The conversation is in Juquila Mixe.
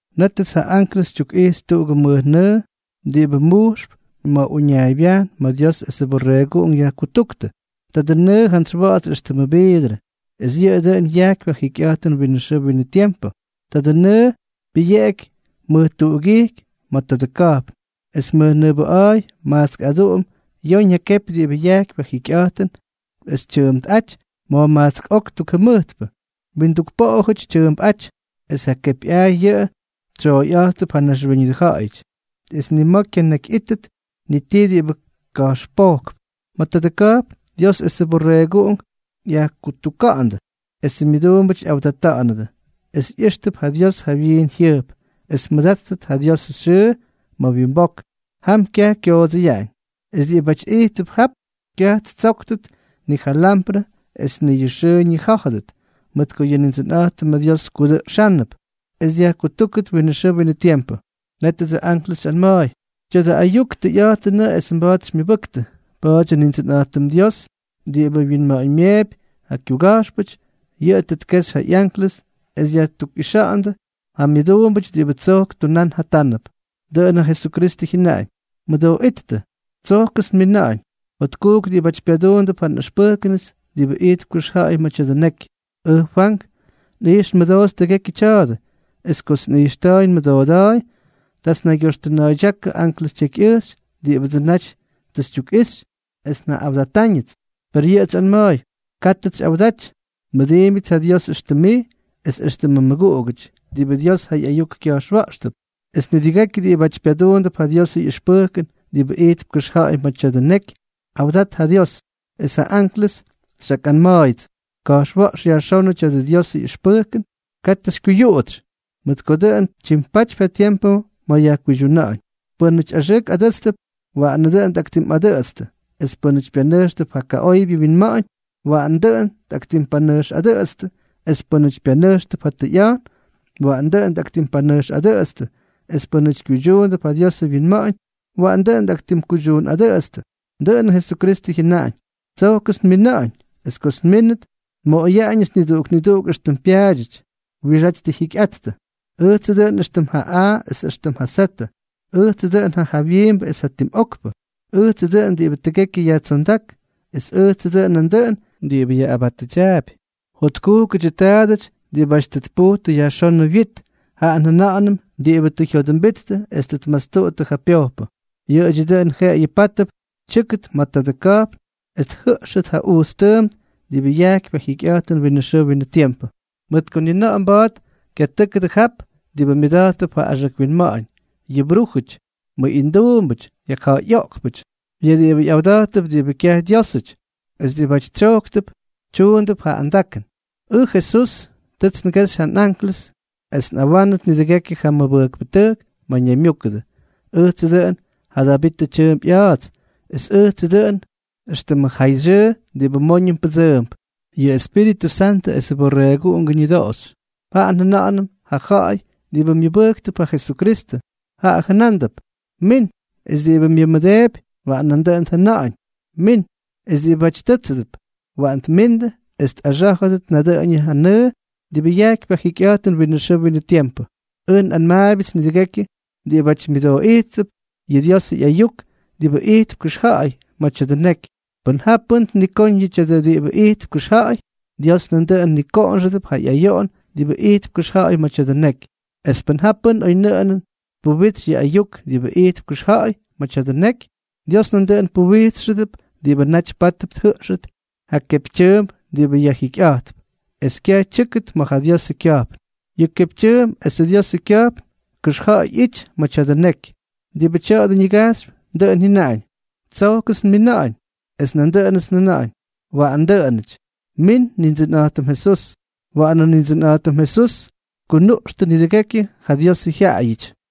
Nétʉts ja anklʉs xytyukꞌijxy tuꞌugʉ mʉjnʉʉ diꞌibʉ mujxp ma̱ uñaaybyajn ma̱ Dios esʉ Borreeguꞌunk yajkutúktʉ. Tadʉ nʉʉ jantsy wa̱ꞌa̱ts éxtʉmʉ viidrʉ, es yʉꞌʉ dʉꞌʉn yajkypy ja jikyꞌa̱jtʉn winʉ xʉʉ winʉ tiempʉ. Tadʉ nʉʉ pyʉyeꞌeky mʉj tuꞌugijky ma̱ tadʉ ka̱jpn. Es mʉjnʉʉbʉꞌa̱a̱y majtsk aduꞌum yoñ ja kepy diꞌibʉ yajkypy ja jikyꞌa̱jtʉn es tyʉʉmpꞌáty ma̱jmajtsk ok tuk jʉmʉjtpʉ, winduk poꞌojʉty tyʉʉmpꞌáty. Es ja kepyꞌaay yʉꞌʉ tsyooyꞌátʉp ja naxwíñʉdʉ ja̱ꞌa̱yʉty. Es ni ma̱ kyanakyꞌítʉt ni tii diꞌibʉ ka̱jxpojkp. Ma̱ tadʉ ka̱jpn, Dios esʉ Borreeguꞌunk yajkutuka̱ꞌa̱ndʉ, esʉ myʉduumbʉty ꞌyawdata̱ꞌa̱nʉdʉ, es ꞌyíxtʉp ja Dios ja wyiin jyʉjp, es tmʉdáttʉt ja Diosʉ xyʉʉ ma̱ wyimbok. Jap kyaj kyoodsʉyaꞌañ. Es diꞌibáty ijttʉp jap, kyaj ttsóktʉt ni ja lyamprʉ es ni yʉ xʉʉ ñijá̱jʉdʉt, mʉt ko yʉ Nindsʉnꞌa̱jtʉm Dios kudʉꞌxánʉp, es yajkutúktʉt winʉ xʉʉ winʉ tiempʉ. Nétʉdsʉ anklʉs xyꞌanma̱a̱y: —Tya̱dʉ ayuk, tʉyꞌa̱jtʉnʉꞌʉ es mba̱a̱t xymyʉbʉktʉ. Pa̱a̱dyʉ Nindsʉnꞌa̱jtʉm Dios diꞌibʉ wyinma̱ꞌa̱ñmyeepy ja kyuga̱jxpʉty, yʉꞌʉ tʉ tkexy ja ꞌyanklʉs es yajtukꞌixa̱ꞌa̱ndʉ ja myʉduumbʉty diꞌibʉ tsojk tunán jatánʉp. Dʉꞌʉn ja Jesukristʉ jyʉnaꞌañ: —¡Mʉdooꞌíttʉ! ¡Tsojkʉts nmina̱ꞌa̱ñ! ¡Jotkujk diꞌibáty pyaduundʉp ja nꞌʉxpʉjkʉnʉts diꞌibʉ ijtp kʉxja̱ꞌa̱y ma̱ tya̱dʉ neky! Ʉj Fwank. Nꞌijx nmʉdoots tʉgekyʉ tya̱a̱dʉ. Es kots nꞌijxta̱a̱y nmʉdooda̱a̱y, taats nnaygyoxtʉna̱a̱ydyákʉ anklʉs tyekyꞌʉjxy diꞌibʉdsʉ naty tʉ xytyukꞌixy, es njaꞌꞌawdatáñʉts. Per yʉꞌʉts xyꞌanma̱a̱y: —Kátʉts xyꞌawdaty. Nmʉdiimbyʉts ja Dios, éxtʉm mij, es éxtʉmʉ mmʉguꞌugʉty diꞌibʉ Dios ja ꞌyayuk kya̱jxwa̱ꞌxʉdʉp, es nidʉgekyʉ diꞌibáty pyaduundʉp ja Diosʉ ꞌyʉxpʉjkʉn diꞌibʉ ijtp kʉxja̱ꞌa̱y ma̱ tya̱dʉ neky. ¡Awdat ja Dios! Es ja anklʉs xyꞌakꞌanma̱a̱yʉts: —Ka̱jxwa̱ꞌx yajxónʉ tya̱dʉ Diosʉ ꞌyʉxpʉjkʉn. Katʉ xykyuyuꞌutsy, mʉt ko tʉ dʉn tyimpatypy ja tiempʉ ma̱ yajkuydyuna̱ꞌa̱ñ. Pʉ́nʉty axʉʉk adʉ́tstʉp, waꞌanʉ dʉꞌʉn tꞌaktimtuunꞌadʉꞌʉtstʉ; es pʉ́nʉty pyanʉjxtʉp ja kaꞌoybyʉ winma̱ꞌa̱ñ, waꞌanʉ dʉꞌʉn tꞌaktimpanʉjxꞌadʉꞌʉtstʉ; es pʉ́nʉty pyanʉjxtʉp ja tʉyꞌa̱jtʉn, waꞌanʉ dʉꞌʉn tꞌaktimpanʉjxꞌadʉꞌʉtstʉ; es pʉ́nʉty kyuydyuundʉp ja Diosʉ wyinma̱ꞌa̱ñ, waꞌanʉ dʉꞌʉn tꞌaktimkuydyuunꞌadʉꞌʉtstʉ. Dʉꞌʉnʉ Jesukristʉ jyʉnaꞌañ: —¡Tsojkʉts nmina̱ꞌa̱ñ! Es kots nmínʉt, nmoꞌoyaꞌañʉts niduꞌuk niduꞌuk éxtʉm pyaadyʉty wiꞌixáty tʉ jyikyꞌattʉ. Ʉjtsʉ dʉꞌʉn éxtʉm ja A es éxtʉmʉ Z, ʉjtsʉ dʉꞌʉn ja jawyiimbʉ es ja tim okpʉ. Ʉjtsʉ dʉꞌʉn diꞌibʉ tʉgekyʉ yajtsondák, es ʉjtsʉ dʉꞌʉn nandʉꞌʉn diꞌibʉ yaꞌꞌabatʉdyaapy. Jotkujkʉdyʉ taadʉty diꞌibáty tʉ tpujtʉ yajxónʉ wyit, jaꞌa njʉna̱ꞌa̱nʉm diꞌibʉ tʉ jyodʉmbittʉ es tʉ tmastuꞌuttʉ ja pyojpʉ. Yʉꞌʉdyʉ dʉn jeꞌeyʉ pátʉdʉp tyʉ́kʉt ma̱ tadʉ ka̱jpn es tjʉꞌxʉt ja ujts tʉʉmp diꞌibʉ yajkypy ja jikyꞌa̱jtʉn winʉ xʉʉ winʉ tiempʉ. Mʉt ko ni na̱ꞌa̱ mba̱a̱t kyatʉ́kʉdʉ jap diꞌibʉ myʉda̱jttʉp ja axʉk winma̱ꞌa̱ñ, yʉ brújʉty, mʉꞌinduumbʉty, yajja̱ꞌa̱yꞌoꞌkpʉty, yʉ diꞌibʉ ꞌyawda̱jttʉp diꞌibʉ kyaj Dyiósʉty, es diꞌibáty tsyojktʉp tyuundʉp ja andakʉn. ’Ʉj Jesús, tʉts ngexy ja nꞌanklʉs es tꞌawánʉt nidʉgekyʉ ja mʉbʉjkpʉtʉjk ma̱ ñaymyúkʉdʉ. Ʉjtsʉ dʉꞌʉn ja Davitʉ tyʉʉmp ꞌya̱a̱ts, es ʉjtsʉ dʉꞌʉn éxtʉmʉ jayxyʉʉ diꞌibʉ móñʉm pʉdsʉʉmp. Yʉ Espíritʉ Santʉ esʉ Borreeguꞌungʉ ñʉdoꞌoxy, jaꞌa njʉna̱ꞌa̱nʉm ja ja̱ꞌa̱y diꞌibʉ myʉbʉjktʉp ja Jesukristʉ, jaꞌa jʉnándʉp: —¡Min! Es diꞌibʉ myʉmʉdeepy, waꞌan nandʉꞌʉn tjʉna̱ꞌa̱ñ: —¡Min! Es diꞌibáty tʉ́tsʉdʉp, waꞌan tmindʉ es tꞌaxá̱jʉdʉt nadʉꞌʉñʉ ja nʉʉ diꞌibʉ yajkypy ja jikyꞌa̱jtʉn winʉ xʉʉ winʉ tiempʉ. Ʉj nꞌanmaabyʉts nidʉgekyʉ diꞌibáty myʉdooꞌijttʉp yʉ Diosʉ ꞌyayuk diꞌibʉ ijtp kʉxja̱ꞌa̱y ma̱ tya̱dʉ neky, pʉn ja pʉ́n tnikóñ yʉ tya̱a̱dʉ diꞌibʉ ijtp kʉxja̱ꞌa̱y, Dios nandʉꞌʉn nikoꞌonxʉdʉp ja ꞌyayoꞌon diꞌibʉ ijtp kʉxja̱ꞌa̱y ma̱ tya̱dʉ neky. Es pʉn ja pʉ́n oynʉꞌʉnʉn tpuwitsy yʉ ayuk diꞌibʉ ijtp kʉxja̱ꞌa̱y ma̱ tya̱dʉ neky, Dios nandʉꞌʉn puwijtsxʉdʉp diꞌibʉ naty pátʉp tjʉꞌxʉt ja kepytyʉʉmp diꞌibʉ yajjikyꞌa̱jtp, es kyaj tyʉ́kʉt ma̱ ja Diosʉ kya̱jpn. Yʉ kepytyʉʉmp esʉ Diosʉ kya̱jpn kʉxja̱ꞌa̱y ꞌyity ma̱ tya̱dʉ neky. Diꞌibʉ tya̱a̱dʉ ñigajxypy, dʉꞌʉn jyʉnaꞌañ: —Tsojkʉts nmina̱ꞌa̱ñ. Es nandʉꞌʉnʉts njʉna̱ꞌa̱ñ: —Waꞌan dʉꞌʉnʉty. ¡Min, Nindsʉnꞌa̱jtʉm Jesús! Waꞌanʉ Nindsʉnꞌa̱jtʉm Jesús tkunuꞌxtʉ nidʉgekyu ja Diosʉ jyaꞌayʉty.